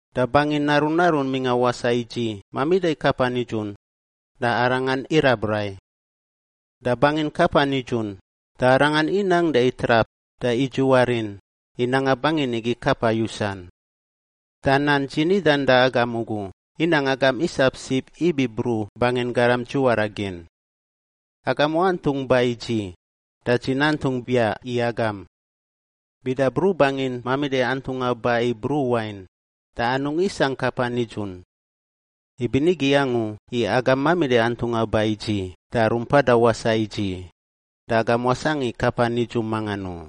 Da bangin narun narun mingꞌa wasaꞌ i dzi mamida kapa nidzun, da Arangan irab rai. Da bangin kapa nidzun, da Arangan inang da itrap da idzuwar in i nanga bangin igi kapa yusan. Da nan dzi nidan da agam ugu inang agam isap sib ibi bruꞌ bangin garam dzuwara gin. Agam wantungꞌ ba i dzi da dzi nantungꞌ biaꞌ i agam. Bida bruꞌ bangin mamida antungꞌa ba i bruꞌ wain, da anungꞌ isangꞌ kapa nidzun. Ibinigi angu i agam mamida antungꞌa ba i dzi da rumpada wasaꞌ i dzi, da agam wasangꞌ i kapa nidzun mangan u.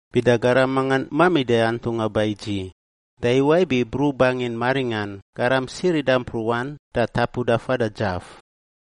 Bida garam mangan mamida antungꞌa ba i dzi, da iwaꞌ ibi bruꞌ bangin maringꞌan garam sirida mpruꞌan da tapuda fada dzaf.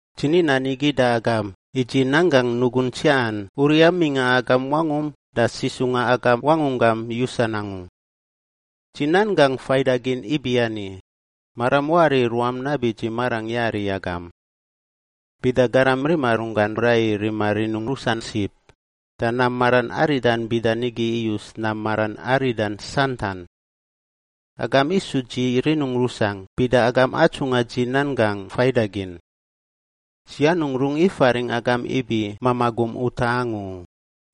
Dzi ni nan igi da agam i dzi nanggangꞌ nugungꞌ tsiaꞌan uriꞌa mingꞌa agam wangum da sisungꞌa agam wangunggam yusan angu. Dzi nan gangꞌ faidagin ibiani: Maram wari i ruam nabi dzi marangꞌ yari i agam. Bida garam rima runggan rai i rima rinun rusan sib, da nam maran aridan bida nigi iyus nam maran aridan santan. Agam isu dzi rinungꞌ rusangꞌ bida agam atsungꞌa dzi nan gangꞌ faidagin. Dzi anungꞌ rungꞌ ifaringꞌ agam ibi mamaꞌ gum utaꞌ angu u,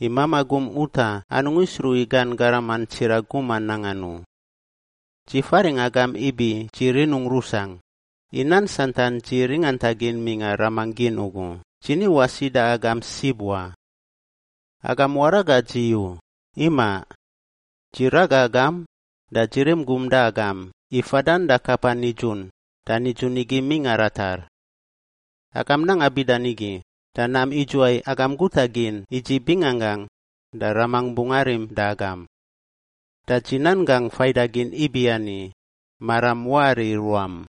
i mamaꞌ gum utaꞌ anungꞌ isruꞌ i gan garaman tsiraꞌ guman nangan u. Dzi faringꞌ agam ibi dzi rinungꞌ rusangꞌ, i nan santan dzi ringantagin mingꞌa Ramangꞌ gin ugu, dzi ni wasi da agam sib wa. Agam waraga dzi u, imaꞌ! Dzi raga agam, da dzi rim gum da agam i fadan da kapa nidzun da nidzun igi mingꞌa ratar. Agam nanga bida nigi da nam idzuwai agam guta gin i dzi binganggangꞌ, da Ramangꞌ bungꞌ arim da agam. Da dzi nan gangꞌ faidagin ibiani: Maram wari i ruam.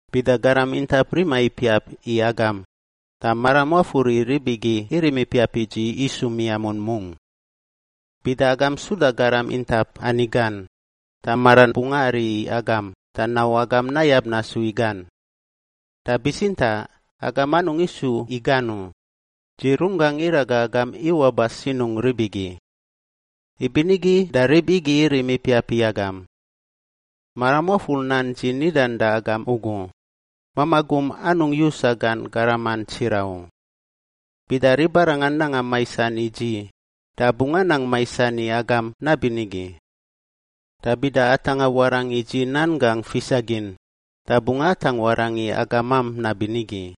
“Bida garam intap rima ipiap i agam da maram wafur i rib igi irim ipiap i dzi isu miamun mungꞌ. Bida agam suda garam intap ani gan, da maran bungꞌ ari i agam da nau agam nayab nasu i gan. Da bitsintaꞌ agam anungꞌ isu i gan u; dzi runggangꞌ iraga agam iwaꞌ ba sinungꞌ rib igi. Ibinigi da rib igi irim ipiap i agam. Maram wafur nan dzi nidan da agam ugu: ‘Mamaꞌ gum anungꞌ yusa gan garaman tsiraꞌ u.’ Bida ribarangan nanga maisan i dzi da bungꞌ anang maisan i agam nabinigi. Da bida atangꞌa warangꞌ i dzi nan gangꞌ fisagin da bungꞌ atangꞌ warangꞌ i agamam nabinigi.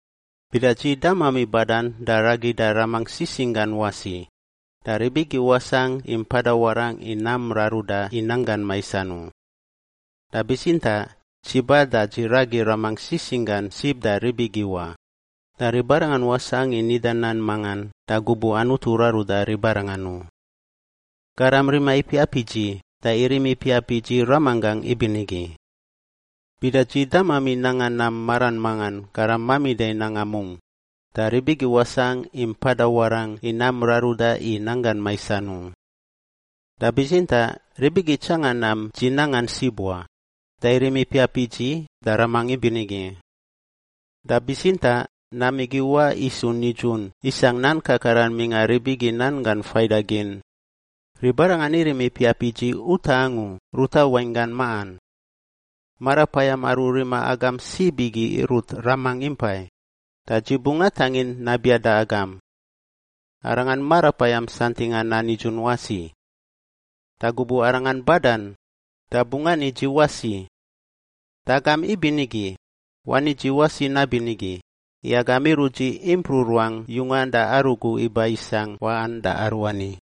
Bida dzi damami badan da ragida Ramangꞌ sisingꞌ gan wasi, da rib igi wasangꞌ i mpada warangꞌ i nam raruda i nanggan maisan u. Da bitsintaꞌ dzi ba da dzi ragi Ramangꞌ sisingꞌ gan sib da rib igi wa, da ribarangan wasangꞌ i nida nan mangan da gubuꞌ Anutu raruda ribarangan u. Garam rima ipiap i dzi da irim ipiap i dzi Ramanggangꞌ ibinigi. Bida dzi damami nanga nam maran mangan garam mamida i nanga mungꞌ, da rib igi wasangꞌ i mpada warangꞌ i nam raruda i nanggan maisan u. Da bitsintaꞌ rib igi itsangan nam dzi nangan sib wa, da irim ipiap i dzi da Ramangꞌ ibinigi. Da bitsintaꞌ nam igi iwaꞌ isu nidzun isangꞌ nan kakaran mingꞌa rib igi Nan Gan Faidagin: ‘Ribarangan irim ipiap i dzi utaꞌ angu ruta wainggan maꞌan.’ Marapayam aru rima agam sib igi irut Ramangꞌ impai, da dzi bungꞌ atangin nabiaꞌ da agam. Arangan Marapayam santingꞌa nan nidzun wasi. Da gubuꞌ Arangan badan, da bungꞌ ani dzi wasi. Da agam ibinigi, wani dzi wasi nabinigi i agam irut dzi impruꞌ ruangꞌ yungan da arugu iba isangꞌ waꞌan da aruani.